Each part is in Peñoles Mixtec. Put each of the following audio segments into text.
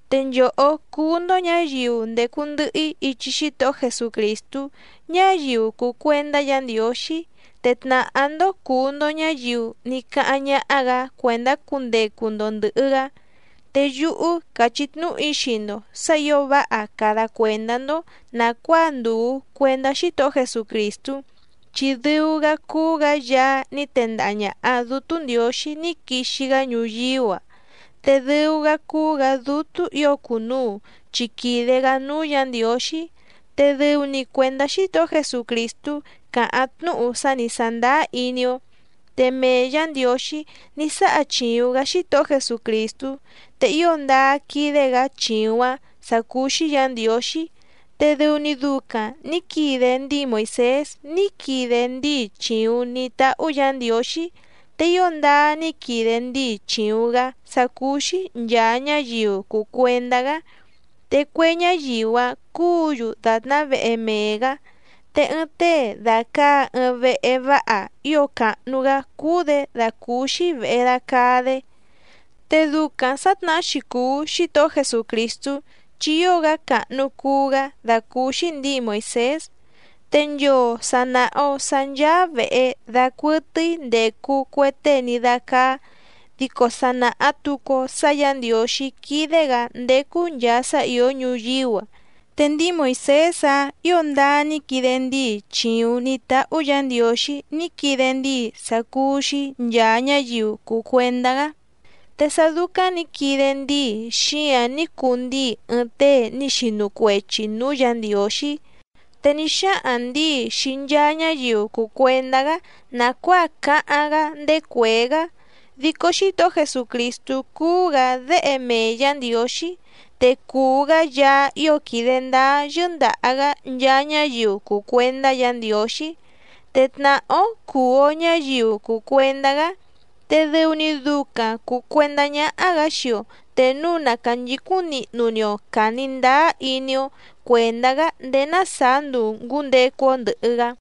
Te nchòhó cúú‑ndó ñǎyiu ndècu ndɨhɨ‑í ichi Xítohó Jesucrìstú ñáyiu cùu cuendá Yǎ Ndiǒxí, te tnàhá‑ndó cùu‑ndo ñáyiu ní cáháⁿ ñáhá‑gǎ cuèndá cundecu‑ndo ndɨ̀hɨ‑gá. Te yúhú càchí tnúhu‑í xii‑ndo sǎ ǐo váha cada cuèndá‑ndó nàcuáa ndùu cuendá Xítohó Jesucrìstú, chi dɨu‑gá cúú‑gǎ Yaá ní tendaha ñàha Dútú Ndiǒxí ní quixi‑gá ñuyíú‑a, te dɨu‑gá cúú‑gǎ Dútú ǐo cùnuu chi quìde‑gá núú Yǎ Ndiǒxí. Te dɨu‑ni cuèndá Xítohó Jesucrìstú càháⁿ tnúhu sá ni sàndáá iní‑ó. Te mee Yǎ Ndiǒxí ní sáha chìuⁿ‑gá Xítohó Jesucrìstú, te ío ndáá quídé‑gǎ chìuⁿ‑áⁿ sǎ cúú‑xí Yǎ Ndiǒxí, te dɨu‑ni ducaⁿ nǐ quide ndíi Moìsés ní quide ndíi chìuⁿ ní táhú Yǎ Ndiǒxí, te ío ndáá ní quide ndíi chìuⁿ‑gá sá cúú‑xí nchàa ñáyiu cùu cuendá‑gá, te cue ñáyiu‑áⁿ cúǔ‑yu dàtná vehe mee‑gǎ. Te ɨɨⁿ tée dàcaa ɨɨⁿ vehe váha ío càhnu‑gá cúú‑dě dàcúúxí vèhe dacaa‑dé. Te ducaⁿ sǎtnahá‑xi cùu Xítohó Jesucrìstú chi ío‑gá càhnu cuu‑gá dàcúúxí ndǐi Moìsés. Te nchoo sà naha‑o sá ncháá vèhe dacuɨtɨ́í ndècu cue tée ní dácáá, dico sa nàha tucu‑o sá Yǎ Ndiǒxí quídé‑gǎ ndécú nchàa sá ìó ñuyíú‑a. Te ndíi Moìsés‑áⁿ ǐo ndáá ní quide ndíi chìuⁿ ní táhú Yǎ Ndiǒxí ní quide ndíi sá cúú‑xí nchàa ñáyiu cùu cuendá‑gá. Te sá dúcáⁿ nǐ quide ndíi xíǎⁿ ní cuu ndíi ɨɨⁿ tée ní xinu cuechi nǔú Yǎ Ndiǒxí. Te ní xáhaⁿ ndǐi xii nchaa ñáyiu cùu cuendá‑gá nàcuáa cáháⁿ‑gá ndéé cuèé‑gá. Dico Xítohó Jesucrìstú cúú‑gǎ Déhe mee Yǎ Ndiǒxí, te cùu‑gá Yaá ío quìde ndáá yɨ́ndàha‑gá nchaa ñáyiu cùu cuendá Yǎ Ndiǒxí. Te tnàhá‑ó cùu‑o ñáyiu cùu cuendá‑gá, te dɨu‑ni ducaⁿ cùu cuendá ñáhá‑gǎ xii‑o te núu na cànchicúⁿ nihnu‑ni‑o càni ndáá iní‑ó cuèndá‑gá ndéé ná sàá nduu ngǔndecu‑o ndɨ̀hɨ‑gá.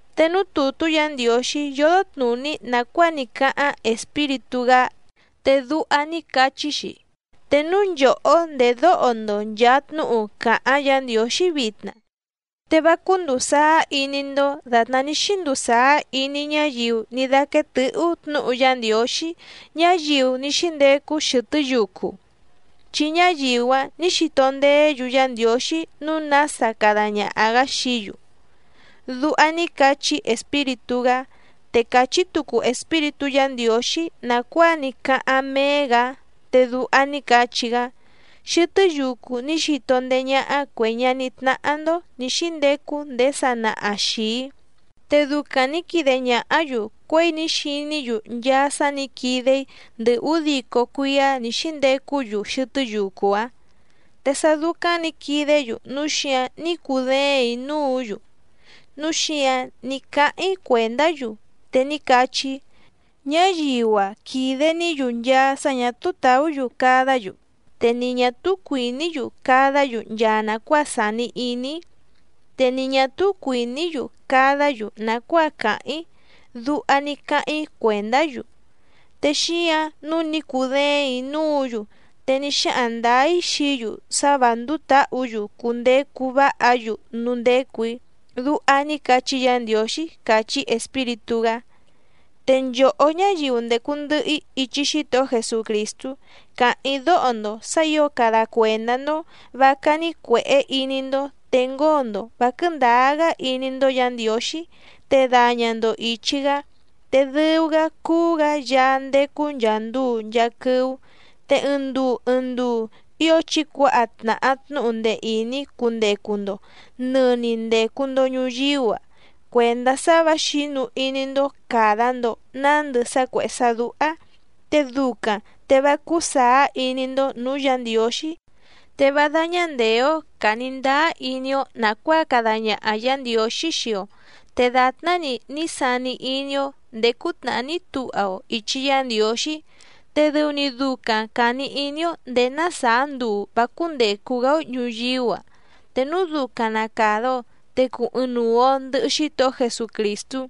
Te núú tùtú Yǎ Ndiǒxí yódó tnùní nàcuáa ní cáháⁿ Espíritú‑gá, te duha ní cachí‑xi: Te núu nchòhó ndèdóho‑ndo nchàa tnúhu càháⁿ Yǎ Ndiǒxí vitna, te vá cúndùu sáá iní‑ndó dàtná ní xínduu sàá iní ñáyiu ní dáquéé tɨ̌hú tnǔhu Yá Ndiǒxí, ñáyiu ní xíndecu xɨtɨ́ yucu, chi ñáyiu‑áⁿ nǐ xito ndeé‑yu Yá Ndiǒxí nǔu nása cada ñaha‑gǎ xií‑yu. Duha ní cachí Espíritú‑gá. Te càchí tucu Espíritú Yǎ Ndiǒxí nàcuáa ní cáháⁿ méé‑gǎ, te duha ní cachí‑gá: Xɨtɨ́ yucu ní xito ndéé ñáhá cuè ñaní tnáhá‑ndó nǐ xíndecu ndéé sanaha xìi‑í, te ducaⁿ nǐ quide ñàhá‑yu cuěi ní xiní‑yu nchaa sá nǐ quide‑í ndɨ ǔdico cuíá nǐ xíndecú‑yu xɨtɨ́ yucu‑áⁿ. Te sá dúcáⁿ nǐ quidé‑yu núu xíǎⁿ ní cudéèⁿ‑í núǔ‑yu, núu xíǎⁿ ní cáháⁿ‑í cuèndá‑yu, te ní cachí‑í: “Ñáyiu‑a quìde‑ní‑yu nchaa sá ñà túú tàú‑yu cadá‑yu te ni ñà túú cuìní‑yu cadá‑yu nchaa nàcuáa sàni iní‑í, te ni ñà túú cuìní‑yu cadá‑yu nàcuáa càháⁿ‑í”, duha ní cáháⁿ‑í cuèndá‑yu. Te xíǎⁿ nǔu ní cudéèⁿ‑í núǔ‑yu te ní xáhaⁿ ndǎá‑í xií‑yu sá vǎ ndúú tǎhǔ‑yu cundecu váha‑yu núú ndécù‑í. Duha ní cachí Yǎ Ndiǒxí càchí Espíritú‑gá. Te nchòhó ñáyiu ndècu ndɨhɨ‑í ichi Xítohó Jesucrìstú, càháⁿ‑í dóho‑ndo sǎ ǐo cada cuèndá‑ndó vǎ cání cuèhé iní‑ndó te ngóo‑ndo vǎ quɨ̀ndáá‑gá iní‑ndó Yǎ Ndiǒxí te daña‑ndo ìchi‑gá, te dɨu‑gá cúú‑gǎ Yaá ndécú nchàa nduu nchaa quɨ́ú. Te ɨɨⁿ nduu ɨɨⁿ nduu ío chí cuǎha tnàha tnúhu ndee ìní cundecu‑ndo nɨ̀ni ndecu‑ndo ñuyíú‑a cuèndá sá vǎ xǐnu iní‑ndó càda‑ndo nándɨ sá cuèhé sá dúhá, te ducaⁿ te vá cúú sàá iní‑ndó nǔú Yǎ Ndiǒxí. Te vá dáñá ndèé‑ó càni ndáá iní‑ó nàcuáa cada ñaha Yǎ Ndiǒxí xii‑o, te dàtná‑ni ní sani iní‑ó ndèé cútnàhá ní tuha‑o ìchi Yá Ndiǒxí, te dɨu‑ni ducaⁿ càni iní‑ó ndèé ná sàá nduu vǎ cúndècu‑gá‑ó ñùyíú‑a, te núu ducaⁿ na càda‑o te cùu ɨɨⁿnuu‑o ndɨhɨ Xítohó Jesucrìstú.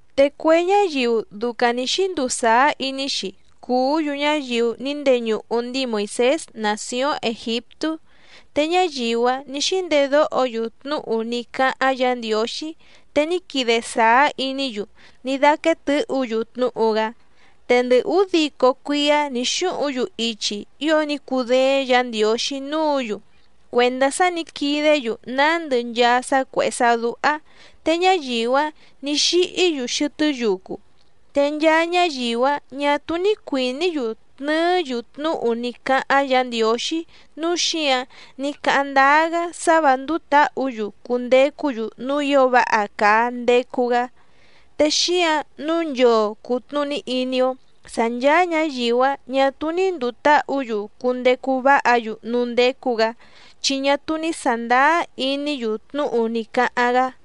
Te cue ñáyiu ducaⁿ nǐ xínduu sàá iní‑xi cùú‑yu ñáyiu ní ndeñuhu ndíi Moìsés nàcióⁿ Ègiptú, te ñáyiu‑áⁿ nǐ xíndedóho‑yu tnúhu ní cáháⁿ Yǎ Ndiǒxí te ní quide sàá iní‑yu ní dáquéé tɨ̌hǔ‑yu tnúhu‑gá. Te ndɨ ǔdico cuíá nǐ xúhuⁿ‑yu ichi ío ní cùdééⁿ Yǎ Ndiǒxí núǔ‑yu cuèndá sá nǐ quidé‑yu nándɨ nchaa sá cuèhé sá dúhá, te ñáyiu‑áⁿ nǐ xíhí‑yu xɨtɨ́ yucu. Te nchaa ñáyiu‑áⁿ ñà túú ní cuìní‑yu tnɨɨ́‑yu tnúhu ní cáháⁿ Yǎ Ndiǒxí nǔu xíǎⁿ ní cáháⁿ ndáá‑gá sá vǎ ndúú tǎhǔ‑yu cundecú‑yu núú ǐo váha càa ndecu‑gá. Te xíǎⁿ nǔu nchoo cùtnuní iní‑ó sǎ nchàa ñáyiu‑áⁿ ñà túú ní ndùu táhǔ‑yu cundecu váha‑yu núú ndécú‑gǎ, chi ñá túú ní sàndáá iní‑yu tnúhu ní cáháⁿ‑gá.